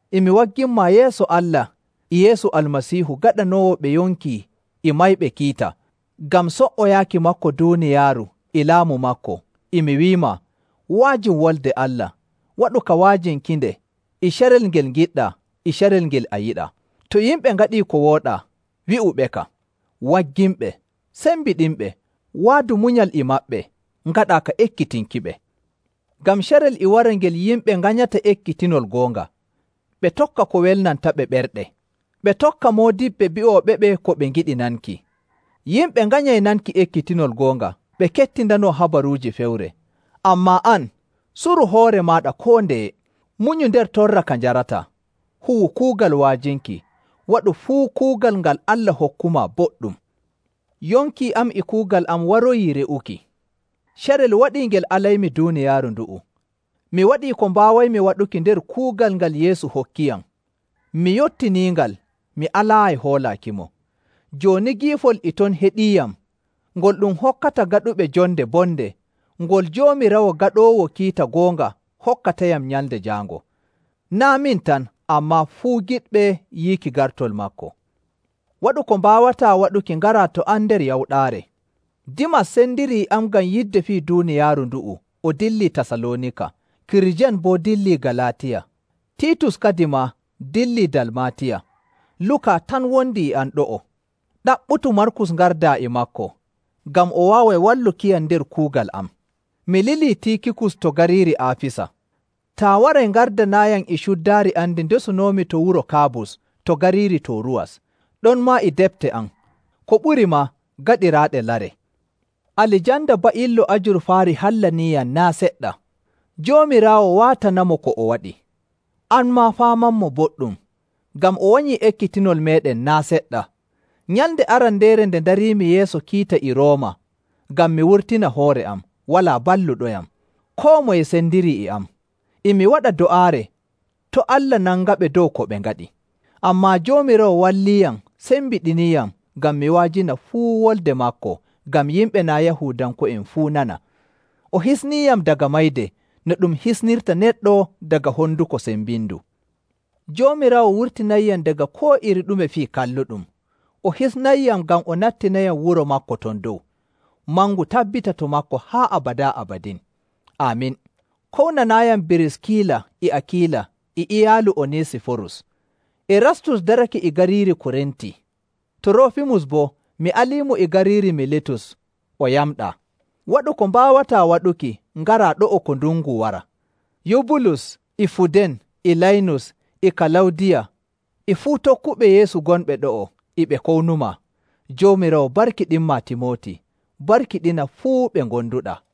E mi wagginmaa yeeso Allah e Yeesu Almasiihu gaɗanoowo ɓe yonki e mayɓe kiita. Ngam so''oyaaki maako duuniyaaru e laamu maako, e mi wi'umaa, wa'ajin Wolde Allah, waɗu ka wa'ajinkinde e carel ngel ngiɗɗaa e carel ngel a yiɗaa. To yimɓe ngaɗii ko wooɗaa, wi'uɓeka, wagginɓe, sembiɗinɓe, waadu munyal e maɓɓe, ngaɗaa ka ekkitinkiɓe. Ngam carel e wara ngel yimɓe nganyata ekkitinol goonga, ɓe tokka ko welnantaɓe ɓerɗe, ɓe tokka moodiɓɓe bi'ooɓeɓe ko ɓe ngiɗi nanki. Yimɓe nganyay nanki ekkitinol goonga, ɓe kettindanoo habaruuji fewre. Ammaa an, suru hoore maaɗa koo ndeye, munyu nder torra ka njarataa, huwu kuugal wa'ajinki, waɗu fuu kuugal ngal Allah hokkumaa boɗɗum. Yonki am e kuugal am waroyii re'uki. Carel waɗii ngel alaymi duuniyaaru ndu'u. Mi waɗii ko mbaawaymi waɗuki nder kuugal ngal Yeesu hokkiyam, mi yottiniingal, mi alaayi hoolaakimo. Jooni giifol e ton heɗiiyam, ngol ɗum hokkata gaɗuɓe jonde bonde, ngol Joomiraawo gaɗoowo kiita goonga hokkatayam Nyalnde Jaango. Naa' min tan, ammaa fuu giɗɓe yiiki gartol maako. Waɗu ko mbaawataa waɗuki ngaraa to am nder yawɗaare. Dimas sendirii e am ngam yidde fii duuniyaaru ndu'u, o dillii Tasaloonika. Kirijen boo dillii Galaatiya, Tiitus kadimaa dillii Dalmaatiya. Luka tan wondi e am ɗo'o. Ɗaɓɓutu Markus ngardaa e maako, ngam o waaway wallukiyam nder kuugal am. Mi lilii Tiikikus to gariiri Aafisa. Taa waray, ngardanaayam e cuddaari am ndi ndesunoomi to wuro Kaabus to gariiri Tooruwas, ɗonmaa e defte am; ko ɓuri maa, gaɗiraaɗe lare. Alijanda ba'illo ajurfaari hallaniiyam naa' seɗɗa. Joomiraawo waatanaymo ko o waɗi. An maa faamanmo boɗɗum, ngam o wanyii ekkitinol meeɗen naa' seɗɗa. Nyalnde arandeere nde ndariimi yeeso kiita e Rooma ngam mi wurtina hoore am, walaa balluɗoyam. Koo moye sendirii e am. E mi waɗa do'aare to' Allah nangaɓe dow ko ɓe ngaɗi. Ammaa Joomiraawo walliiyam sembiɗiniiyam ngam mi wa'ajina fuu wolde maako ngam yimɓe naa' Yahuudanko'en fuu nana. O hisniiyam daga mayde no ɗum hisnirta neɗɗo daga honduko sembindu. Joomiraawo wurtinayyam daga koo iri ɗume fii kalluɗum, o hisnayyam ngam o nattinayam wuro maako ton dow. Mangu tabbita to maako haa abadaa abadin. Aamin. Kownanaayam Biriskila e Akiila e iyaalu Onesiforus. Erastus darake e gariiri Korinti. Turoofimus boo, mi aliimo e gariiri Militus o yamɗaa. Waɗu ko mbaawataa waɗuki ngaraa ɗo'o ko ndungu wara. Yubulus, e Fuden, e Laynus, e Kalawdiya, e fuu tokkuɓe Yeesu gonɓe ɗo'o e ɓe kownumaa. Joomiraawo barkiɗinmaa Timooti, barkiɗina fuu ɓe ngonduɗaa.